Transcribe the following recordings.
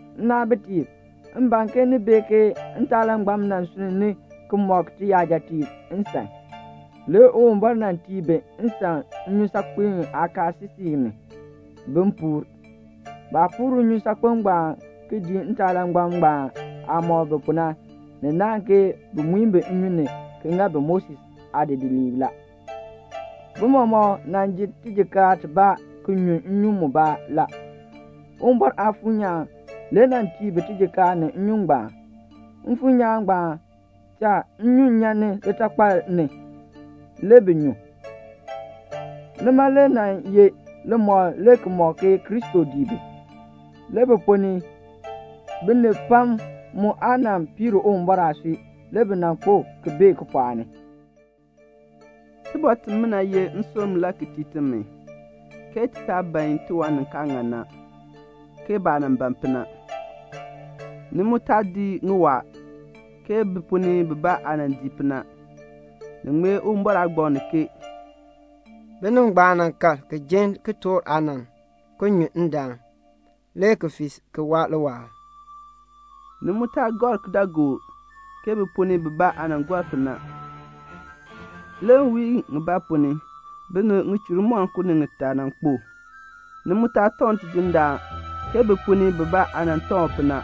Nnaabitiib, m ban ke ni bee ke ntaalangbam nan sunn ni ki mɔk tiyajatiib nsan. Le Uwumbɔr nan tii bi nsan nnyusaakpem aakaasisik ni, bin puur. Baah puur nnyusaakpem ngbaan ki dii ntaalangbam ngbaan aah mɔk bi pu na, ni naahn ke bi muin bi nnyun ni ki ŋa bi Moses aadidiliib la. Bi mɔmɔk nan ji tijikaar tibaa ki nyu nnyun mubaa la. Uwumbɔr Aafuur nyaan le nan tii bi tijikaar ni nnyun ngbaan. Mfuur nyaan ngbaan cha nnyun nyan ni litakpal, le bi nyu. Nima le nan ye limɔkl le ki mɔk ke Kristo dii bi. Le bi ponn ni binib pam mu aa nan piir Uwumbɔr aasui. Le bi nan kpo ki bee kipɔɔk ni. Tibɔr timina ye nsurm le ki tii timi, ke ti taa ban tiwan ni kaa ŋan na, ke baah nan ban pu na. Ni mu taa dii ŋiwaa, ke bi ponn ni bibaa aah nan dii pu na; ni ŋmee Uwumbɔr aagbaŋ ni ke "Binib ngbaan nan kal ki jin kitork aanann, ki nyu ndaan, le ki fii ki waa liwaal." Ni mu taa gɔr kidaagook ke bi ponn ni bibaa aah nan gɔr pu na, le nwiin mbaa ponn ni binib ŋichur moninko ni ŋitaa nan kpo. Ni mu taa tɔŋ Tidindaan ke bi ponn ni bibaa aah nan tɔŋ u pu na,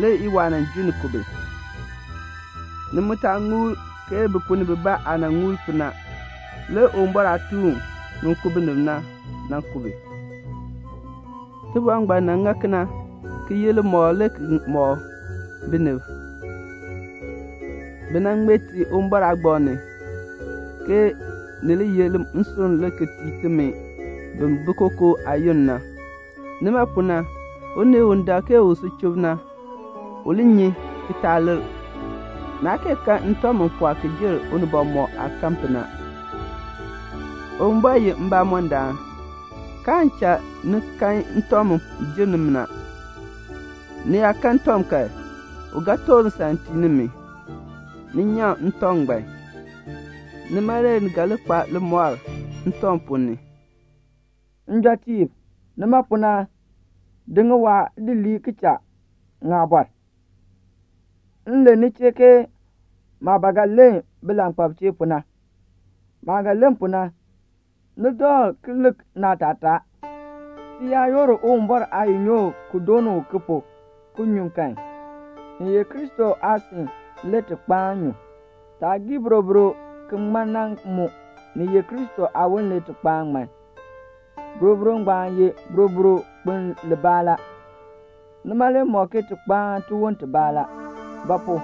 le iwaa junni ku bi. Ni mu taa ŋuli ke bi ponn ni bibaa aah nan ŋuli pu na, le Uwumbɔr aatuun u ku binib na, nan ku bi. Tibɔr ngbaan nan ŋa bi kena ki ye limɔkl le ki mɔk binib. Bi nan ŋmee ti Uwumbɔr aagbaŋ ni, ke ni li ye nsurm le ki tii timi bi bi kookoo aayoonn na. Nima pu na unii u dak ke u si chub na, u li nyi ki taa lir. Naa kee kan ntɔŋ mu pɔɔ ki jer unibɔn mɔk aah kanni pu na. Uwumbɔr ye mbamɔndaan, kaan cha ni kan ntɔŋ mu jer nimi na. Ni yaa kan ntɔŋ kan, u ga toor nsan tii nimi, ni nyaŋ ntɔŋ ngbaan. Nima na le ni ga li kpa limɔr ntɔŋ ponn ni. Njɔtiib, nima pu na, di ŋiwaa di lii ki cha ŋaabɔr. M len ni chee ke maah ba ga len bilankpalb chee pu na. Maah ga len pu na, ni dakl ki lik naatataa. Ti yaa yoor Uwumbɔr aayinyook ki dooni u ki pu, ki nyu kan, ni ye Kristo aasin le ti kpaan nyu. Taah gii boroboro ki ŋman na mu, ni ye Kristo aawon le ti kpaan ŋman. Boroboro ngbaan ye boroboro kpiln libaa la. Nima le mɔk ke ti kpaan tiwon tibaa la; ba pu?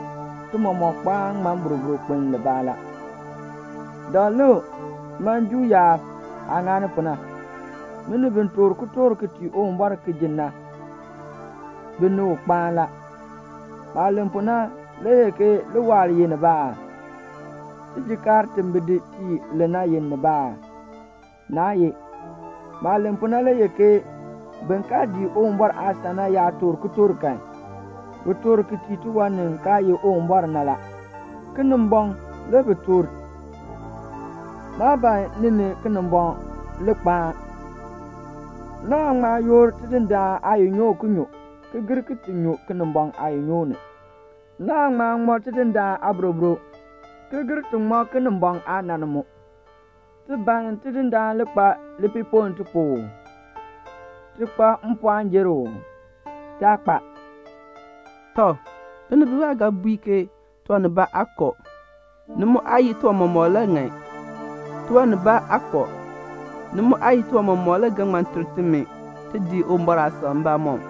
ti mɔmɔk kpaan ŋman boroboro kpiln libaa la. Dakl lik man Juu yaab aah ŋani pu na. Binib bi toor kitork ki tii Uwumbɔr ki ji na, bi ni u kpaan la. Maah len pu na le ye ke liwaal ye nibaa aa? Tijikaar ti bi di tii li na ye nibaa aa? Naa ye. Maah len pu na le ye ke bin kaa dii Uwumbɔr aasan na yaa toor kitork kan, bi toor ki tii tiwan ni kaa ye Uwumbɔr na la. Kinimbɔŋ le bi toor tii. Maa ban ni ni Kinimbɔŋ le kpaan. Naan ŋma yoor Tidindaan aayinyook ki nyu, ki gir ki ti nyu Kinimbɔŋ aayinyook ni. Naan ŋma ŋman Tidindaan aaboroboro, ki gir ti ŋman Kinimbɔŋ aanann mu. Ti ban Tidindaan le kpa lipiipoln ti pu uu? Ti kpa mpɔɔn jer u uu? Taa kpa. Tɔ, binib bibaa ga bui ke tiwan nibaa aa kɔ. Ni mu aa ye tiwan mɔmɔk le ŋan. Tiwan nibaa aa kɔ. Ni mu aa ye tiwan mɔmɔk le ga ter timi ti dii Uwumbɔr aasan mbamɔm.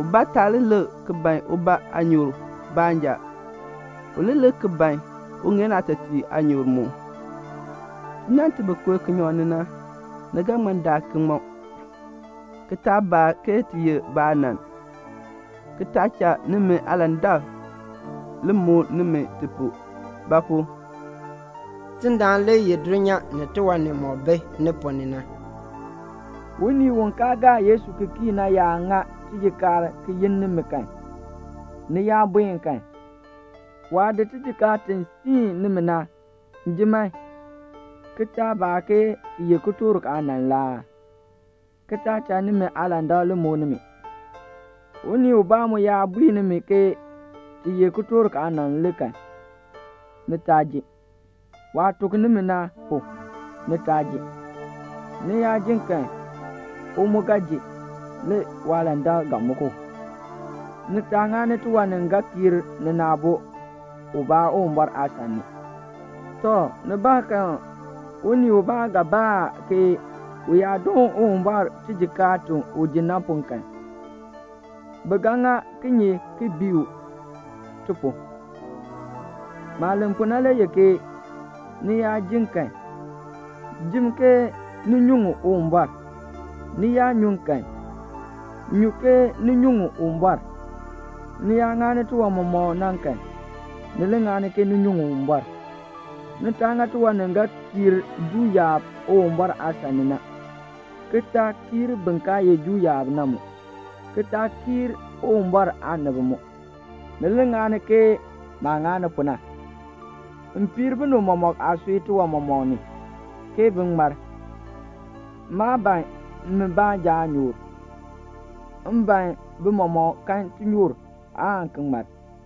Ubaa taa li lik ki ban ubaa aanyoor baanja. U li lik ki ban uŋeen aatɔtiib aanyoor mu. Tinann ti bi kooh kinyaŋ ni na, ni ga ŋma daa ki ŋmɔ, ki taa baa ke ti ye ba aanann, ki taa cha nimi aalandak li muk nimi ti pu; ba pu? Tidindaan le yeh dulnyaa ni tiwan nimɔk bi ni ponn ni na. Unii u kaa gaa Yesu ki kii na yaa ŋa tijikaar ki yi nimi kan, ni yaa buen kan, waah di tijikaar ti siin nimi na, jim man, ki taa baa ke ti ye kitork aanann la aa? ki taa cha nimi aalandak li muk nimi. Unii ubaa mu yaa bui nimi ke ti ye kitork aanann le kan, ni taa ji. Waah tuk nimi na pu, ni taa ji. Ni yaa jin kan, u mu ga ji, le waalandak ga muk u. Ni taa ŋani tiwan ni ga kiir nina aabo ubaa Uwumbɔr aasan ni. Tɔ, nibaakan unii ubaa ga baa ke u yaa doon Uwumbɔr tijikaar ti u ji na pu kan, bi ga ŋa kinye ki bii u ti pu? Maah len pu na le ye ke ni yaa jin kan, jim ke ni nyuŋ Uwumbɔr; ni yaa nyun kan, nyum ke ni nyuŋ Uwumbɔr; ni yaa ŋani tiwan nimɔk na kan, ni li ŋani ke ni nyuŋ Uwumbɔr. Ni taa ŋa tiwan ni ga kiir Juu yaab Uwumbɔr aasan ni na, ki taa kiir bin kaa ye Juu yaab na mu, ki taa kiir Uwumbɔr aanib mu. Ni li ŋani ke maah ŋani pu na. M piir binib mɔmɔk aasui tiwan mɔmɔk ni, ke bin ŋmar. Maa ban mi baanja aanyoor. M ban bi mɔmɔk kan tinyoor, aan ki ŋmar.